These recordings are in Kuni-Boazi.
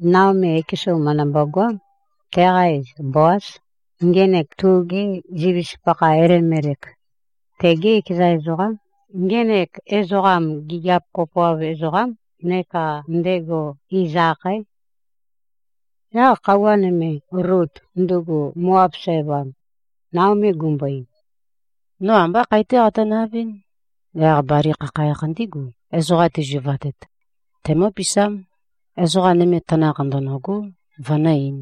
Naomi ekesu mø̀ndømbo-goám. Teqa iz Boáz. Ngenek tugi zivis-pakha Elimelek, tegé ekeza ezoqám. Ngenek ezoqam gigiap kopoav ezoqám, neka ndego iz-akhaé. Yaq khøuwa nøme, Lut, ndugu Moab sævam, Naomi gumbo-ein, “No ambá khae-té qatønavɨ́n. Yaq bali khakhayakh ndigu, ezoqa tizuvatet, tæmǿpisám. Ezoqa nøme tanakh ndø̀nøgó, vønǿ-eīn.”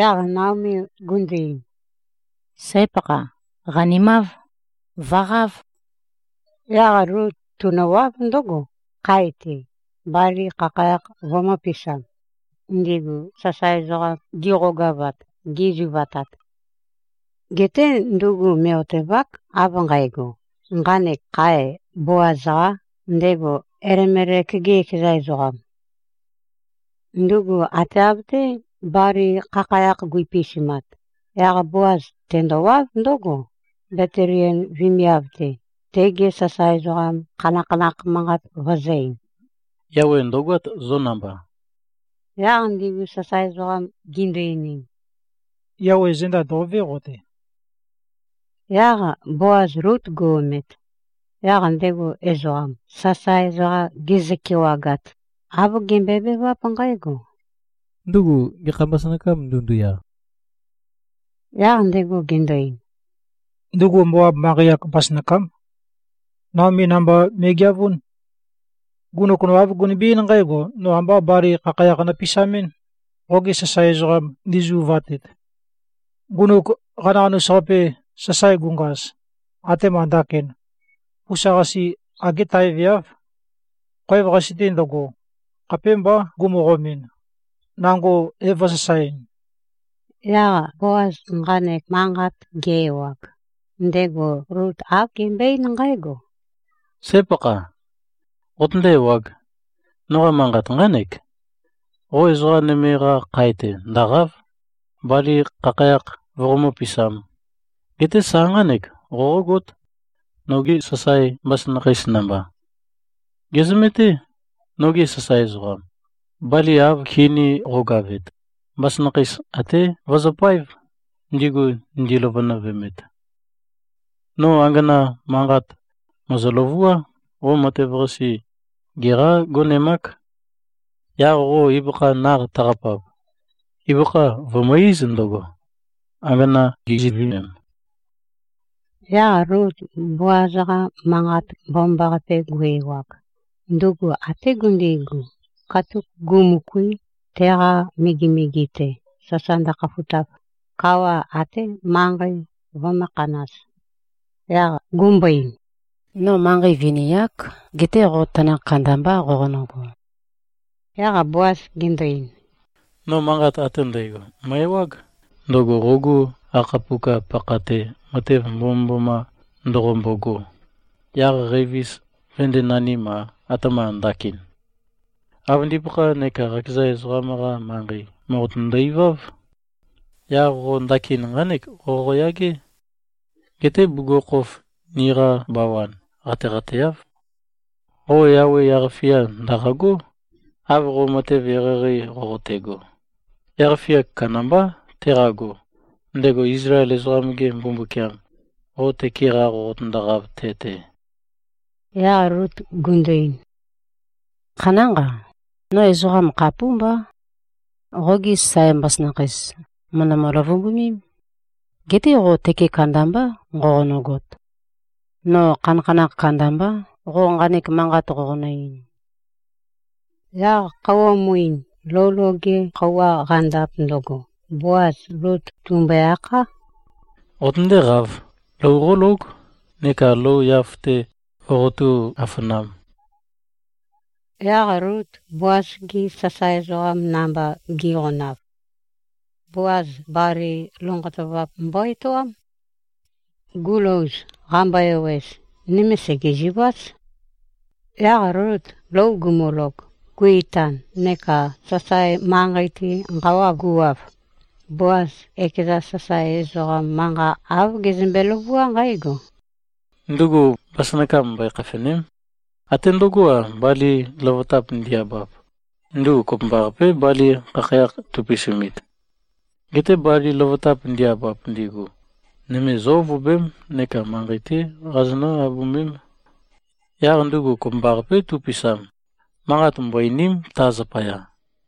Yaq Naomi gundu-ein, “Sǽ-pakha. Qanimáv. Vø̀qáv.” Yaq Lut tunøwáv ndǿgo, khae-te, bali khakhayakh vømø̄pisam, ndigu sasae ezoqam gi꞉qogavat, gi꞉zuvatat. Geté ndugu mè꞉-otevák av nqægo, nqanek khae Boaz-qā, ndego Elimelek-ge ekeza ezoqam. Ndugu ate av-té bali khakhayakh guipisumat, yaq Boaz tendowáv ndǿgo, Betliem vemiav-te, tegi sasae ezoqam khanakhanakh manqat vøzø̄-ein, “Yawe ndø̀goát zo namba.” Yaq ndigu sasae ezoqam gindu-einim, “Yawe zenda ndò꞉vé qo-te.” Yaq Boaz Lut gu-omet, yaq ndego ezoqam, sasae ezoqa gezø-kewagat, āv gembøebeváp nqǽgo, “Ndugu gekha mbasønakâm ndunduya?” Yaq ndego gendo-ein, “Ndugu Moab manqei-ak mbasønakám. Naomí namba me꞉geavún. Ngunuk no āv gunømbe-eín nqǽgo, ‘No ambá bali khakhayakh nopisamɨ́n, qogi sasae ezoqam ndi꞉zuvatet.’ Ngunuk qanaqanus-qape sasae gungaz atema ndakin, pusa-qase agé taeveáv. Khoev-qase-te ndøgo, khapémbá gumøqomɨn, nango é-vø̄sasaeɨn.” Yaq Boaz nqanek manqat ge-ewag, ndego Lut āv gembøe-eín nqǽgo, “Sǽ-pakha. Qotøndé-ewāg. Noqa manqat nqánek. Qo ezoqa nøme-qa khae-te ndø̀qa᷄v, bali khakhayakh voqomǿ-pisām. Geté sa nqánek, qoqógót, nogi sasae mbasønakheis namba. Gèzømeté, nogi sasae ezoqam. Bali av kini-qogavet, mbasønakheis até vøzøpáev, ndigu ndiløvønøvemet. No angana manqa mø̀ezø-løvuá. Qo matev-qase geqá-gonemák. Yaq qo ibøkha naq taqapap, ibøkha vø̀mø-íz ndøgo, angana giziøvemem.” Yaq Lut Boaz-qa manqat mbomambaqape gu-ewag, ndugu até gundigu, katuk gumø̀kuī, teqa megemege-te, sasa ndøkhafutav, kawa até manqei vømbō-khanaz. Yaq gumbo-ein, “No manqei vini-ák. Geté qo tanakh kandambá qoqonøgo.” Yaq Boaz gendo-ein, “No manqat ate ndægo mø̀e-ewág, ndøgo qogu qakhapuka-pakha-te matev mbomømboma ndoqombogo, yaq qævis vøndēnanim-a, atema ndakin. Qavøndipakha neka qakeza ezoqam-qa manqei mòqotøndo-iváv. Yaq qo ndakin nqánek qoqoyagé. Geté bugukhokhof niqa bawan qateqateáv. Qo Yawe yaq-fia ndø̀qagó, av qo matev eqeieqei qoqotego. Yaq-fia kandambá teqago, ndego Izlael ezoqam-ge Mbumbukiam, qo tøke-qa qoqotøndoqav te-te.” Yaq Lut gundu-ein, “Khanánqa. No ezoqam khapúmbá. Qogi sasae mbasønakheis mø̀ndømø-løvumbumím. Geté qo tøke kandambá nqoqonøgot. No khanakhanakh kandambá, qo nqanek manqat qoqonø-ein.” Yaq khøuwa muin, lou loge khøuwa qandap ndøgo, Boaz Lut tùmbøe-akhá, “Qotøndéqāv. Lou qólóg, neka lou yaf-te voqotú-afanām.” Yaq Lut Boaz-gi sasae ezoqam namba gi꞉qonav, Boaz bali lonqotøvap mbo-etoám. Gulouz, qambo-ewez, nøme sègeziváz. Yaq Lut lou gumulog, gu-itan neka sasae manqei-te nqawa guwav, Boaz ekeza sasae ezoqam manqa āv gezømbe-løvuá nqǽgo, “Ndugu mbasønakam mbøe-khafène᷄m. Até ndøgó-a, bali løvøtap ndi-abap, ndugu kopømbaqapé bali khakhayakh tupisumit. Geté bali løvøtap ndi-abap ndigu, nøme zó-ovobém, neka manqei-té qazonǿ-abømém. Yaq ndugu kopømbaqapé tupisam. Manqat mbo-eìni᷄m ta zapaya.”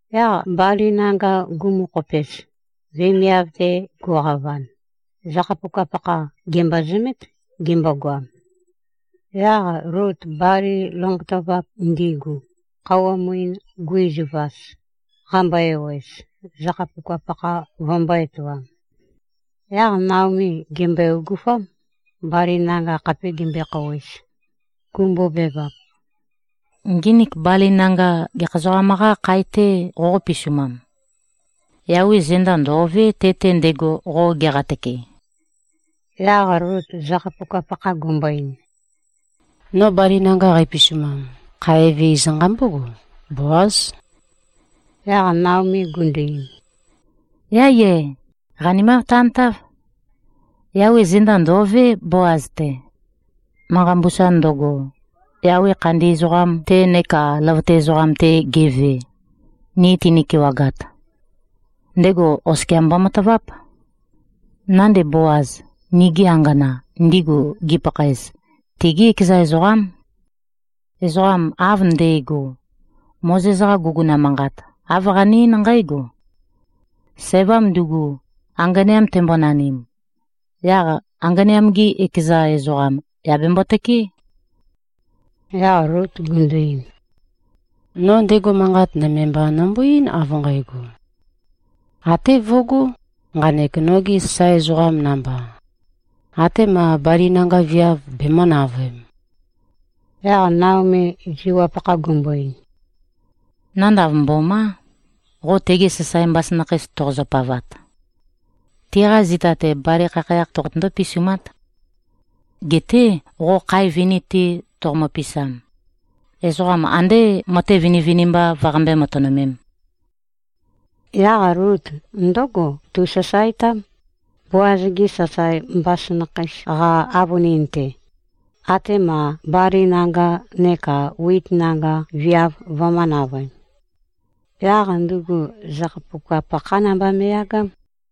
Yaq bali nanga gumokhopez, vemiav-te guqavan, zakhapuka-pakha gèmbozømét, gimbogoam. Yaq Lut bali lonqotøvap ndigu, khøuwa muin guizivaz, qambo-ewez, zakhapuka-pakha vømbō-etoam. Yaq Naomi gèmbøe-ogofám, bali nanga khape gimbøekhouwez, gumbobevap, “Nginik bali nanga gekha ezoqam-qâ khae-tē qoqó-pisumam? Yawe zenda ndò꞉vé, te-te ndego qo geqatøke.” Yaq Lut zakhapuka-pakha gumbo-ein, “No bali nanga qæpisumam, khae eve iz nqambógo, Boáz.” Yaq Naomi gundu-ein, “Yáiyé! Qanimav tantáv. Yawe zenda ndò꞉vé, Boaz-te. Manqa mbusa ndøgo, Yawe khandi ezoqam-te neka løvøte ezoqam-te geve, ni tini-kewagat, ndego oskia mbomataváp. Nande Boaz, nigi angana, ndigu gipakhaez, tigí ekeza ezoqám. Ezoqam av nde꞉go, Mozes-qa guguna manqat āv qane-eín nqǽgo: Sævam ndugu anganeam tembonanim, yaq anganeam-gi ekeza ezoqam yà bembo-tøkeé.” Yaq Lut gundu-ein, “No ndego manqat nøme mba nømbo-eín av nqægo, ‘Até vøgó, nqanek nogi sasae ezoqam namba, atema bali nanga viav bemø̄-navøem.’” Yaq Naomi ziwap-pakha gumbo-ein, “Nanda mbomá, qo tegi sasae mbasønakheis toqozø-pavat. Tiqa zita-te bali khakhayakh toqotøndó-pisumát. Geté qo khae vini-te toqomø-pisam, ezoqam andé matev vinivinimba vøqambé-matønømēm.” Yaq Lut ndǿgo tusasaetám, Boaz-gi sasae mbasønakheis-qa avønin-te, atema bali nanga neka wit nanga viav vømø̄-navøem. Yaq ndugu zakhapuka-pakhá namba me꞉yagám.